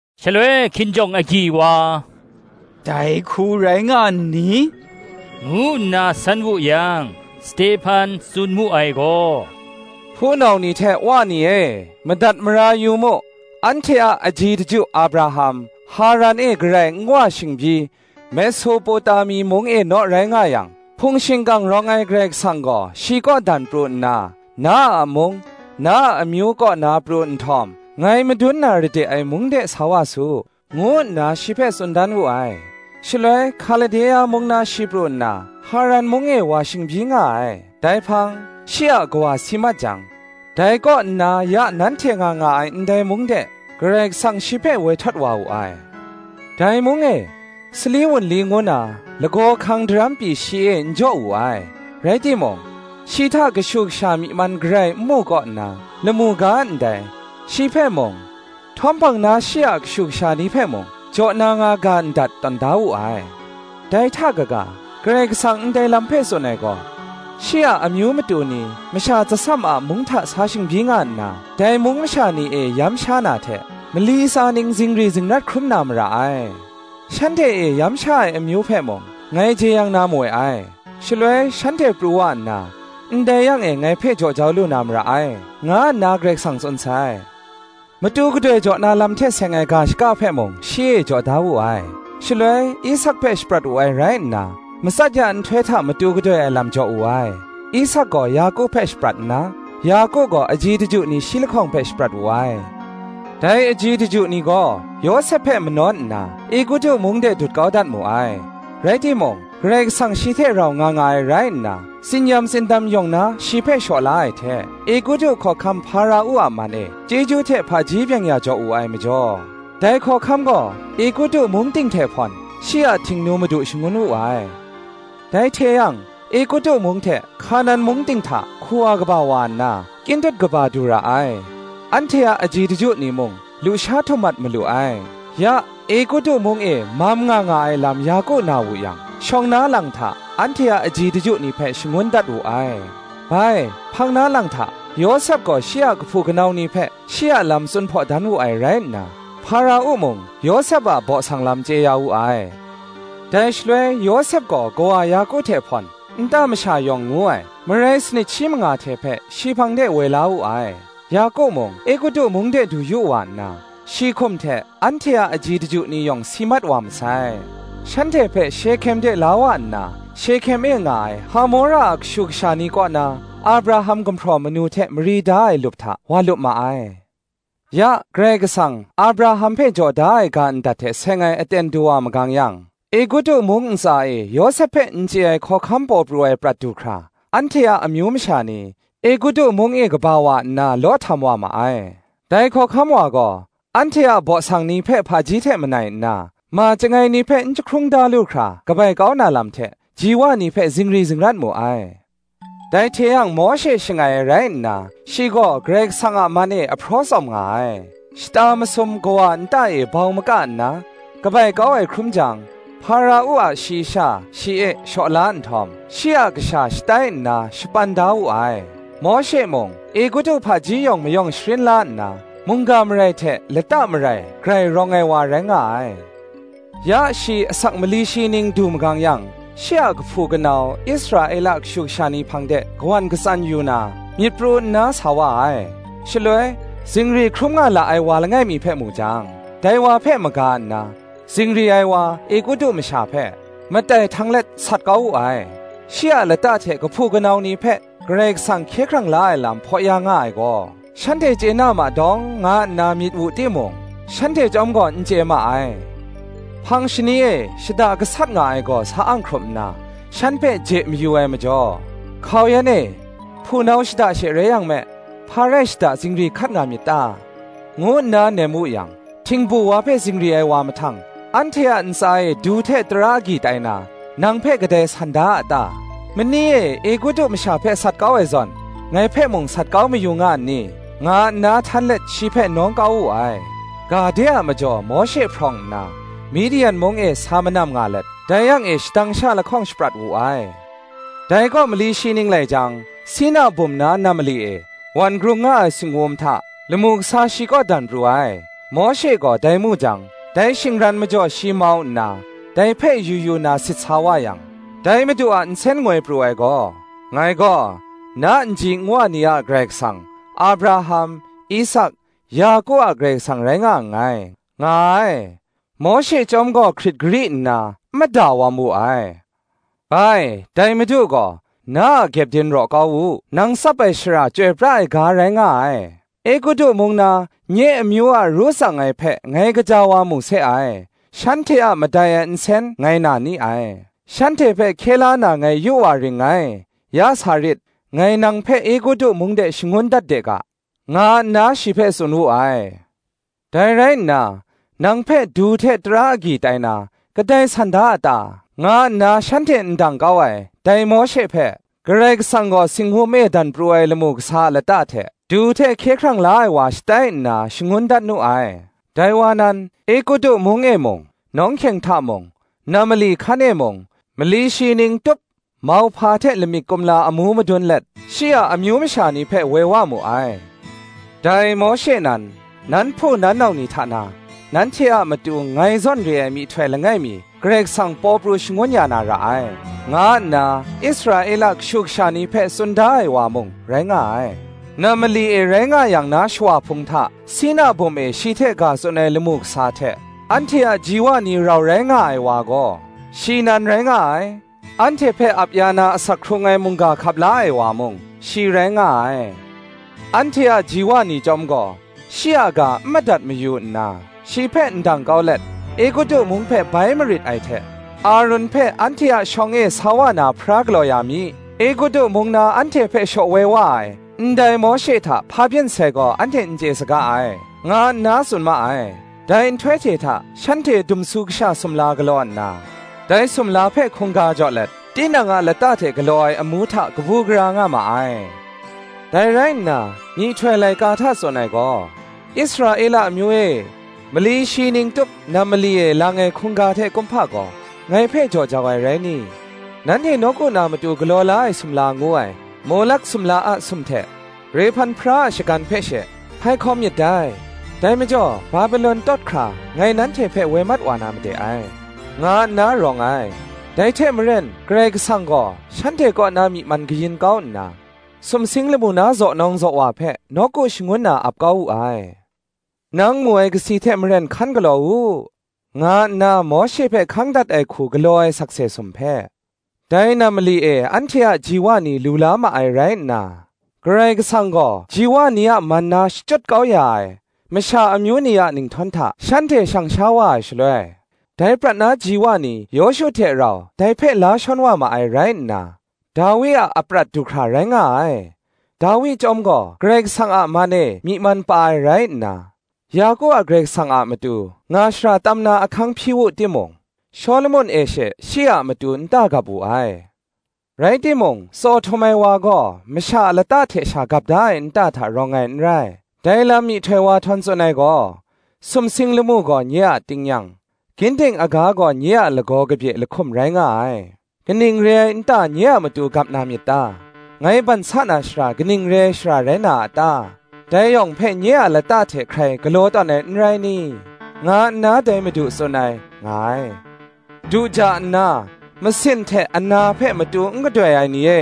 Shaloi hkinjawng agyi wa, “Dai hku rai nga n ni?” ngu nna san wu yang, Stehpan tsun mu ai gaw, “Hpunau ni hte wa ni e, madat mara yu mu: anhte a aji daju Abraham, Haran e garai n wa shingbyi, Mesopotami mung e naw rai nga yang, hpung shingkang rawng ai Karai Kasang gaw shi kaw dan pru nna, ‘Na a mung, na amyu kaw na pru nhtawm, ngai madun na ra de ai mung de sa wa su,’ ngu nna, shi hpe tsun dan wu ai. Shaloi Hkalde a mung na shi pru nna, Haran mung e wa shingbyi nga ai; dai hpang, shi a kawa si mat jang, dai kaw nna ya nanhte nga nga ai ndai mung de, Karai Kasang shi hpe woi htawt wa wu ai: dai mung e, sali wunli ngu na, lagaw hkang daram pyi shi e n jaw wu ai; rai timung, shi hta kashu kasha myi man garai n mu kaw nna, lamu ga ndai, shi hpe mung, htawm hpang na shi a kashu kasha ni hpe mung, jaw na nga ga ndat tawn da wu ai. Dai hta kaga, Karai Kasang ndai lam hpe tsun ai gaw, shi a amyu matu ni masha tsasam a mung hta sa shingbyi nga nna, dai mung masha ni e yam sha na hte, mali tsa ning zingri zingrat hkrum na mara ai: shanhte e yam sha ai amyu hpe mung, ngai jeyang na mawe ai; shaloi shanhte pru wa nna, ndai yang e ngai hpe jaw jau lu na mara ai, nga nna Karai Kasang tsun sai. Matu gadoi jaw na lam hte seng ai ga shaka hpe mung shi e jaw dat wu ai; shaloi Isak hpe shaprat wu ai rai nna, matsat ya nhtoi hta matu gadoi ai lam jaw wu ai: Isak gaw Yaku hpe shaprat nna, Yaku gaw aji daju ni shi lahkawng hpe shaprat wu ai. Dai aji daju ni gaw Yawsep hpe manawn nna, Egutu mung de dut kau dat mu ai. Rai timung, Karai Kasang shi hte rau nga nga ai rai nna, tsin-yam tsindam yawng na shi hpe shaw la ai hte, Egutu hkawhkam Hpara-u a man e chyeju hte hpaji byeng-ya jaw wu ai majaw, dai hkawhkam gaw Egutu mung ting hte hpawn, shi a htingnu madu shangun wu ai. Dai hte yang Egutu mung hte Hkanan mung ting hta hku wa kaba wa nna, kyin dut kaba du ra ai; anhte a aji daju ni mung lusha htum mat malu ai. Ya Egutu mung e mam nga nga ai lam Yaku na wu yang, shawng na lang hta, anhte a aji daju ni hpe shangun dat wu ai. Bai hpang na lang hta, Yawsep gaw shi a kahpu kanau ni hpe shi a lam tsun hpaw dan wu ai rai nna, Hpara-u mung Yawsep a baw sang lam chye ya wu ai. Dai shaloi Yawsep gaw kawa Yaku hte hpawn, nta masha yawng ngu ai, marai sanit shi manga hte hpe, shi hpang de woi la wu ai. Yaku mung Egutu mung de du yu wa nna, shi hkum hte anhte a aji daju ni yawng si mat wa masai; shanhte hpe Shehkem de la wa nna, Shehkem e nga ai Hamora a kashu kasha ni kaw na, Abraham gumhpraw manu hte mari da ai lup hta wa lup ma ai. Ya Karai Kasang Abraham hpe jaw da ai ga ndat hte seng ai aten du wa magang yang, Egutu mung ntsa e Yawsep hpe n chye ai hkawhkam paw pru ai prat du hkra, anhte a amyu masha ni Egutu mung e kaba wa nna law htam wa ma ai. Dai hkawhkam wa gaw, anhte a baw sang ni hpe hpaji hte manai nna, ma chyangai ni hpe n jahkrung da lu hkra kabai kau na lam hte, ji wa ni hpe zingri zingrat mu ai. Dai hte yang Mawshe shangai ai rai nna, shi gaw Karai Kasang a man e ahpraw tsawm nga ai; shata masum kawa nta e bau maka nna, kabai kau ai hkrum jang, Hpara-u a shayi sha shi e shaw la nhtawm, shi a kasha shatai nna shapan da wu ai. Mawshe mung Egutu hpaji yawng mayawng sharin la nna, mungga marai hte lata marai grai rawng ai wa rai nga ai. Ya shi asak mali shi ning du magang yang, shi a kahpu kanau Israela kashu kasha ni hpang de kawan katsan yu na, myit pru nna sa wa ai. Shaloi, zingri hkrum nga la ai wa langai mi hpe mu jang, dai wa hpe maga nna, zingri ai wa, Egutu masha hpe, matai htang let sat kau wu ai: shi a lata hte kahpu kanau ni hpe, Karai Kasang hkye hkrang la ai lam hpaw ya nga ai gaw, shanhte chye na ma dawng, nga nna myit wu timung, shanhte chyawm gaw n chye ma ai. Hpang shani e shada gasat nga ai gaw sa ang hkrup nna, shan hpe je mayu ai majaw, ‘Hkau yan e, hpunau shada she rai yang me, hpa rai shada zingri hkat nga myit ta?’ ngu nna nem wu yang; htingbu wa hpe zingri ai wa mahtang, ‘Anhte a ntsa e du hte tara agyi tai na, nang hpe kadai san da a ta? Mani e Egutu masha hpe sat kau ai zawn, ngai hpe mung sat kau mayu nga n ni?’ nga nna htan let shi hpe nawng kau wu ai. Ga de a majaw Mawshe hprawng nna, Midian mung e sa manam nga let, dai yang e shadang sha lahkawng shaprat wu ai. Dai kaw mali shi ning lai jang, Sina bum na nam mali e wan grung nga ai singwum hta, lamu kasa shi kaw dan pru ai. Mawshe gaw dai mu jang, dai shingran majaw shi mau nna, dai hpe yu yu na nga sit sa wa yang, dai Madu a nsen ngoi pru ai gaw, “Ngai gaw, na nji nwa ni a Karai Kasang, Abraham, Isak, Yaku a Karai Kasang rai nga nngai,” nga ai. Mawshe chyawm gaw hkrit gari nna, n mada wam wu ai. Bai, dai Madu gaw, “Na a kyepdin raw kau u; nang tsap ai shara chyoi pra ai ga rai nga ai. Egutu mung na nye amyu a ru tsang ai hpe ngai gaja wa mu se ai; shanhte a madai ai nsen ngai na ni ai; shanhte hpe hkye la na ngai yu wa ring ngai; ya sa rit, ngai nang hpe Egutu mung de shangun dat de ga,” nga nna shi hpe tsun wu ai. Dai rai nna, Nang hpe du hte tara agyi tai na, kadai san da a ta? nga nna shanhte ndang kau ai, dai Mawshe hpe, Karai Kasang gaw singwum e dan pru ai lamu kasa a lata hte, du hte hkye hkrang la ai wa shatai nna shangun dat nu ai. Dai wa nan, Egutu mung e mung, Nawng hkyeng hta mung, nam mali hkan e mung, mali shi ning tup mauhpa hte lamik kumla amu madun let, shi a amyu masha ni hpe woi wa mu ai. Dai Mawshe nan, ‘Nan hpu nan nau ni hta na, nanhte a matu ngai zawn re ai myihtoi langai mi Karai Kasang paw pru shangun ya na ra ai,’ nga nna Israela kashu kasha ni hpe tsun da ai wa mung, rai nga ai. Nam mali e rai nga yang na shawa hpung hta, Sina bum e shi hte ga tsun ai lamu kasa hte, anhte a ji wa ni rau rai nga ai wa gaw, shi nan rai nga ai; anhte hpe ap ya na asak hkrung ai mungga hkap la ai wa mung, shi rai nga ai: anhte a ji wa ni chyawm gaw shi a ga n madat mayu nna, shi hpe ndang kau let, Egutu mung hpe bai marit ai hte, Arun hpe, ‘Anhte a shawng e sa wa na Hpara galaw ya mi; Egutu mung na anhte hpe shaw woi wa ai, ndai Mawshe hta hpa byin sai gaw anhte n chye saga ai,’ nga nna tsun ma ai. Dai nhtoi hte hta shanhte dumsu kasha sumla galaw nna, dai sumla hpe hkungga jaw let, tinang a lata hte galaw ai amu hta kabu gara nga ma ai. Dai rai nna, myihtoi laika hta tsun ai gaw, ‘Israela amyu e; mali shi ning tup nam mali e lang ai hkungga hte kumhpa gaw, Ngai hpe jaw jau ai rai ni? Nanhte nawku na matu galaw la ai sumla ngu ai, Molak sumla a sum hte, Rehpan Hpara a shagan hpe she, hpai hkawm myit dai: Dai majaw Babelon tawt hkra ngai nanhte hpe woi mat wa na made ai,' nga nna rawng ai; dai hte maren Karai Kasang gaw shanhte kaw na myi man kayin kau nna, sumsing lamu na zaw nawng zaw wa hpe nawku shangun na ap kau wu ai. Nang mu ai kasi hte maren hkan galaw u, nga nna Mawshe hpe hkang dat ai hku galaw ai sakse sum hpe, dai nam mali e anhte a ji wa ni lu la ma ai rai nna; Karai Kasang gaw ji wa ni a man na shachyut kau ya ai masha amyu ni a ninghtawn hta shanhte shang sha wa ai shaloi, dai prat na ji wa ni Yawshu hte rau dai hpe la shawn wa ma ai rai nna, Dawi a aprat du hkra rai nga ai: Dawi chyawm gaw Karai Kasang a man e myi man pa ai rai nna, Yaku a Karai Kasang a matu nga shara tam na ahkang hpyi wu timung, Shawlumon e she shi a matu nta gap wu ai. Rai timung Tsaw Htum ai Wa gaw masha a lata hte sha gap ai nta hta rawng ai n rai; dai lam myihtoi wa htawn tsun ai gaw, ‘Sumsing lamu gaw nye a tingnyang, Ginding aga gaw nye a lagaw kabye lahkum rai nga ai: Kaning re ai nta nye a matu gap na myit ta? Ngai ban sa na shara kaning re ai shara rai na a ta? Dai yawng hpe nye a lata hte hkrai galaw tawn ai n rai ni? Nga nna dai Madu tsun ai,’ nga ai. Du ja nna, masin hte ana hpe matu n gadoi ai ni e,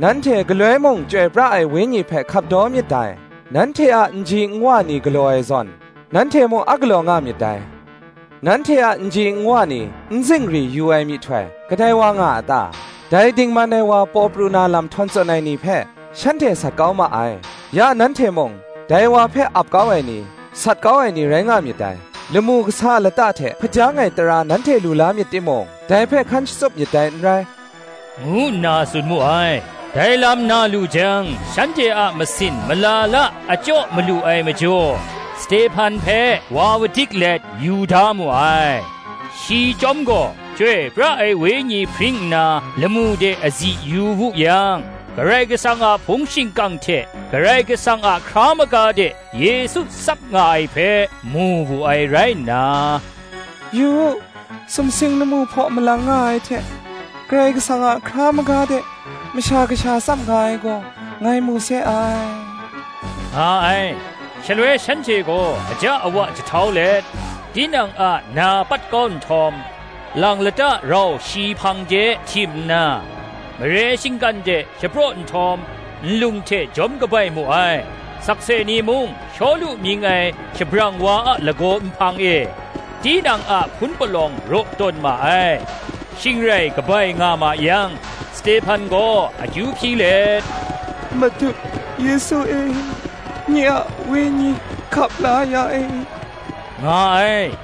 nanhte galoi mung Chyoi pra ai Wenyi hpe hkap daw myit dai; nanhte a nji nwa ni galaw ai zawn, nanhte mung a galaw nga myit dai. Nanhte a nji nwa ni n zingri yu ai myihtoi, kadai wa nga a ta? Dai Dingman ai Wa paw pru na lam htawn tsun ai ni hpe, shanhte sat kau ma ai; ya nanhte mung dai wa hpe ap kau ai ni, sat kau ai ni, rai nga myit dai; lamu kasa a lata hte hpajang ai tara nanhte lu la myit timung, dai hpe hkan shatsup myit dai n rai,” ngu nna tsun mu ai. Dai lam na lu jang shanhte a masin mala la achyaw malu ai majaw, Stehpan hpe wa udik let yu da mu ai. Shi chyawm gaw Chyoi pra ai Wenyi hpring nna, lamu de azi yu wu yang, Karai Kasang a hpung shingkang hte Karai Kasang a hkra maga de Yesu tsap nga ai hpe, mu wu ai rai nna, “Yu u, sumsing lamu hpaw malang nga ai hte, Karai Kasang a hkra maga de Masha Kasha tsap nga ai gaw, ngai mu se ai,” nga ai. Shaloi shanhte gaw aja awa jahtau let, tinang a na pat kau nhtawm, lang lata rau shi hpang de htim nna, mare shinggan de shapraw nhtawm, nlung hte jawm kabai mu ai: sakse ni mung, Shawlu mying ai shabrang wa a lagaw nhpang e, tinang a hpun palawng raw tawn ma ai. Shing rai kabai nga ma yang Stehpan gaw akyu hpyi let, “Madu Yesu e, nye a wenyi hkap la ya e,” nga ai.